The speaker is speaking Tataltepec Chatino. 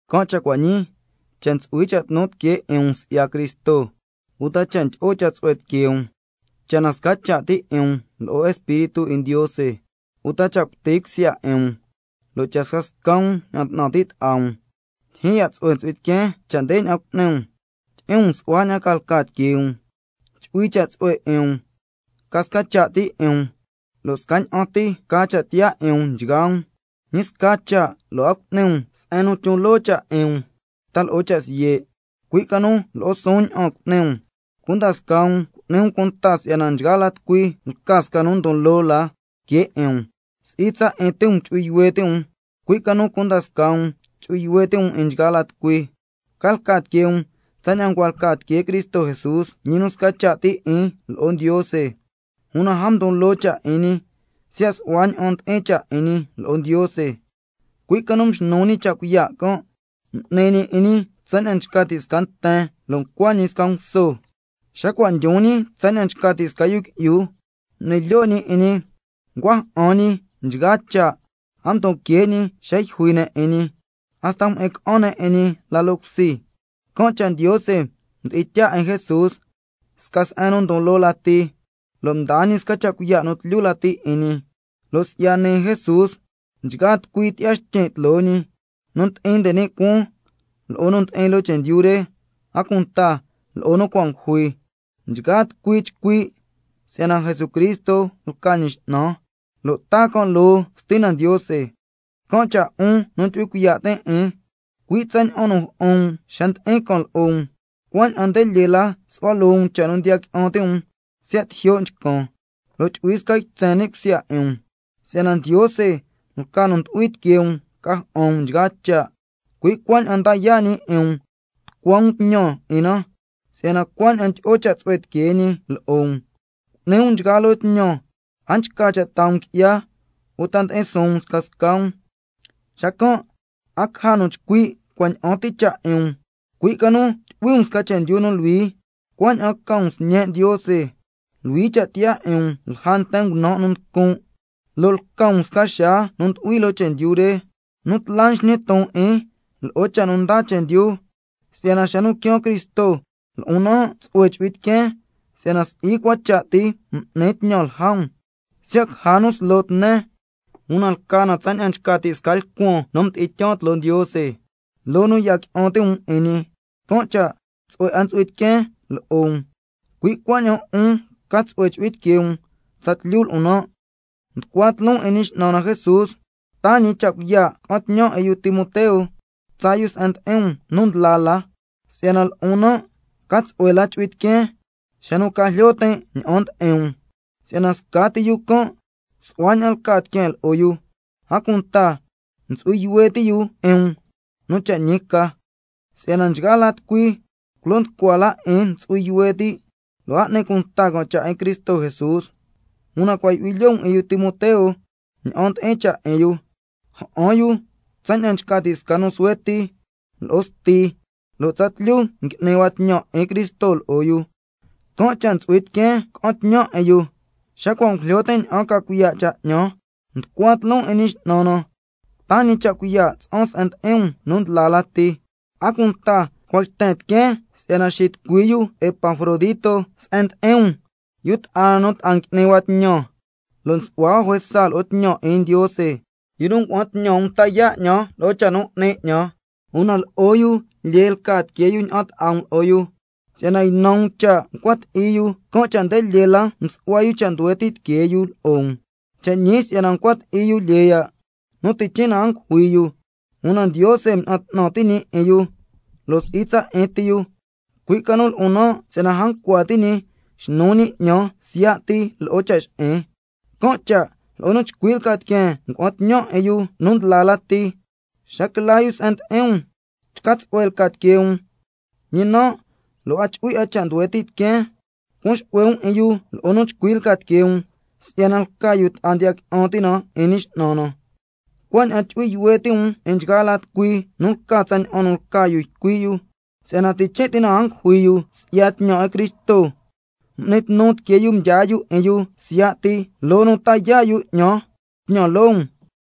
Can' cha' cua' ñii, cha' ntsu'hui cha' tnu tiquee 'in um si'ya Cristo, uta cha' ndyi'o cha' tsu'hue tiquee um, cha' na sca cha' ti' 'in um lo'o Espíritu 'in Ndiose, uta cha' cuti cusya 'in um, lo' cha' scasca um ña'an 'tnan ti' ta'a um, ndyijyin ya' tsu'hue ntsu'hui tiqueen cha' ndeña'an cu'ni um: Tyi'in um su'hua ña'an ca lca tiquee um, chu'hui cha' tsu'hue 'in um, ca sca cha' ti 'in um, lo' scaña'an ti ca cha' tiyaa 'in um nchgaa um. Ñi sca cha' lo' a cu'ni um se'en nu tyon loo cha' 'in um ta lo'o cha' siye', cui' ca nu lo'o suun ña'an cu'ni um, cunda scaa um cu'ni um cunta si'yana nchgaa tucui lca sca nu ndon loo la que 'in um, si'i tsa 'in ti um chu'hui yuhue ti' um, cui' ca nu cunda scaa um chu'hui yuhue ti' um 'in nchgaa la tucui. Ca lca tiquee um tsaña'an ncua lca tiquee Cristo Jesús, ñi nu sca cha' ti 'in lo'o Ndiose, una a mdon loo cha' 'in ñi siya' su'hua ña'an ndi'in cha' 'in ñi lo'o Ndiose, cui' ca nu mxnu ñi cha' cuiya' can', m'ni ñi 'in ñi tsaña'an nchca ti' sca nguso, lo' ngula ñi tsaña'an ngula sca nten. Xa cua' ndyon ñi tsaña'an nchca ti' sca yu qui'yu, m'ni lyo' ñi 'in ñi, ncua ja'an ñi nchgaa cha', a mdon que' ñi xa yjui ne' 'in ñi, hasta mjyi'in ca'an ne' 'in ñi la loo cusi. Can' cha' Ndiose mdi'in tyaa 'in Jesús sca se'en nu ndon loo la ti, lo' mdaa ñi sca cha' cuiya' nu tlyu lati 'in ñi, lo' si'ya nii Jesús —nchgaa tucui tyi'ya xtyin' tloo ñi—, nu ndi'in nde ni' cuaan lo'o nu ndi'in loo chendyu re, a cunta lo'o nu cua' ngujui, nchgaa tucui chcui' si'yana Jesucristo lca ñi X'nan, lo' taa can' loo Stina Ndiose. Can' cha' 'un, jun nu ndyu'hui cuiya' tin' 'in, cui' tsaña'an nu ja'an um xa ndi'in can lo'o um, cuaña'an nde lyee la su'hua loo um cha' nu ndiya qui'an ti' um siya' tijyo' nchcan, lo' chu'hui sca ytsen ni' cusya 'in um. Si'yana Ndiose lca nu ndu'hui tiquee um ca ja'an um nchgaa cha', cui' cuaña'an nda yaa' ñi 'in um tucua um tñan 'in na, si'yana cuaña'an ndyi'o cha' tsu'hue tiquee ñi lo'o um. Cu'ni um nchgaa loo tñan, a nchca cha' taa um qui'ya uta ndi'in suun um scasca um, xacan' a caja nu chcui' cua' ña'an ti cha' 'in um, cui' ca nu tyu'hui um sca chendyu nu luhui, cuaña'an ca um sñe' Ndiose, luhui cha' tiyaa 'in um lja nten ngunan' nu nducun', lo' lca um sca xaa nu ndu'hui loo chendyu re, nu tla nsñi ton 'in lo'o cha' nu ndaa chendyu, si'yana xa nu quiaan Cristo lo'on nan' tsu'hue chu'hui tiqueen si'yana si'i cua cha' ti m'nin tñan lja um. Siya' caja nu slo tnen, una lca na tsaña'an nchca ti' sca lcuan nu mdi'in tyaa um tloo Ndiose loo nu ndiya qui'an ti' um 'in ñi, can' cha' tsu'hue 'a ntsu'hui tiqueen lo'o um. Cui' cuaña'an 'un ca tsu'hue chu'hui tiquee um tsatlyu lo'on nan'. Nducua tloon 'in Ñi X'nan na Jesús si'yana taa ñi cha' cuiya' ca'an tñan 'in yu Timoteo tsaa yu se'en ndi'in um nu ndla la, si'yana lo'on nan' ca tsu'hue la chu'hui tiqueen xa nu ca jlyo tin' ña'an ndi'in um, si'yana scati yu can' su'hua ña'an lca tiqueen lo'o yu, a cunta ntsu'hui yuhue ti' yu 'in um nu cha' ñi ca. Si'yana nchgaa la tucui culo nducua la 'in ntsu'hui yuhue ti', lo' a n'ni cunta can' cha' 'in Cristo Jesús. Una cua' ndyu'hui lyoo um 'in yu Timoteo ña'an ndi'in cha' 'in yu, ja'an yu tsaña'an nchca ti' sca nu suhue ti lo'o sti, lo' tsa tlyu ngui'ni hua tñan 'in Cristo lo'o yu. Can' cha' ntsu'hui tiqueen ca'an tñan 'in yu, xa cua' ngujlyo tin' ña'an ca cuiya' cha' 'ñan. Nducua tloon 'in Ñi X'nan na cha' taa ñi cha' cuiya' tsa'an se'en ndi'in um nu ndla lati. A cunta cua' yten tiqueen si'yana xitucui yu Epafrodito se'en ndi'in um, yu ta'a na nu ta'a ngui'ni hua tñan lo' nsu'hua hua juesa lo'o tñan 'in Ndiose, yu nu ngua'an tñan um ta yaa' 'ñan lo'o cha' nu 'ni 'ñan. Una lo'o yu lyee lca tiquee yu ña'an ta'a um lo'o yu, si'yana ynan um cha' ncua ti'i yu, can' cha' nde lyee la msu'hua yu cha' nduhue ti' tiquee yu lo'o um. Cha' ñi si'yana ncua ti'i yu lyee ya', nu tichin' na a ngujui yu, una Ndiose mña'an 'tnan ti' ñi 'in yu, lo' si'i tsa 'in ti yu, cui' ca nu lo'on nan', si'yana a ncua ti' ñi xnu ñi 'ñan siya' ti lo'o cha' xi'in. Can' cha' lo'o nu chcui lca tiqueen ngua'an tñan 'in yu nu ndla la ti, xa quila yu se'en ndi'in um chca tsu'hue lca tiquee um, ñi nan' lo' a chu'hui 'a cha' nduhue ti' tiqueen. Cuan xu'hue um 'in yu lo'o nu chcui lca tiquee um si'yana lca yu ta'a ndiya qui'an ti' na 'in Ñi X'nan na, cuaña'an chu'hui yuhue ti' um 'in nchgaa la tucui nu lca tsaña'an nu lca yu ycui' yu, si'yana tichin' ti na a ngujui yu si'ya tñan 'in Cristo, m'ni tnu tiquee yu mdyaa yu 'in yu siya' ti, loo nu ta yaa' yu 'ñan tñan loo um.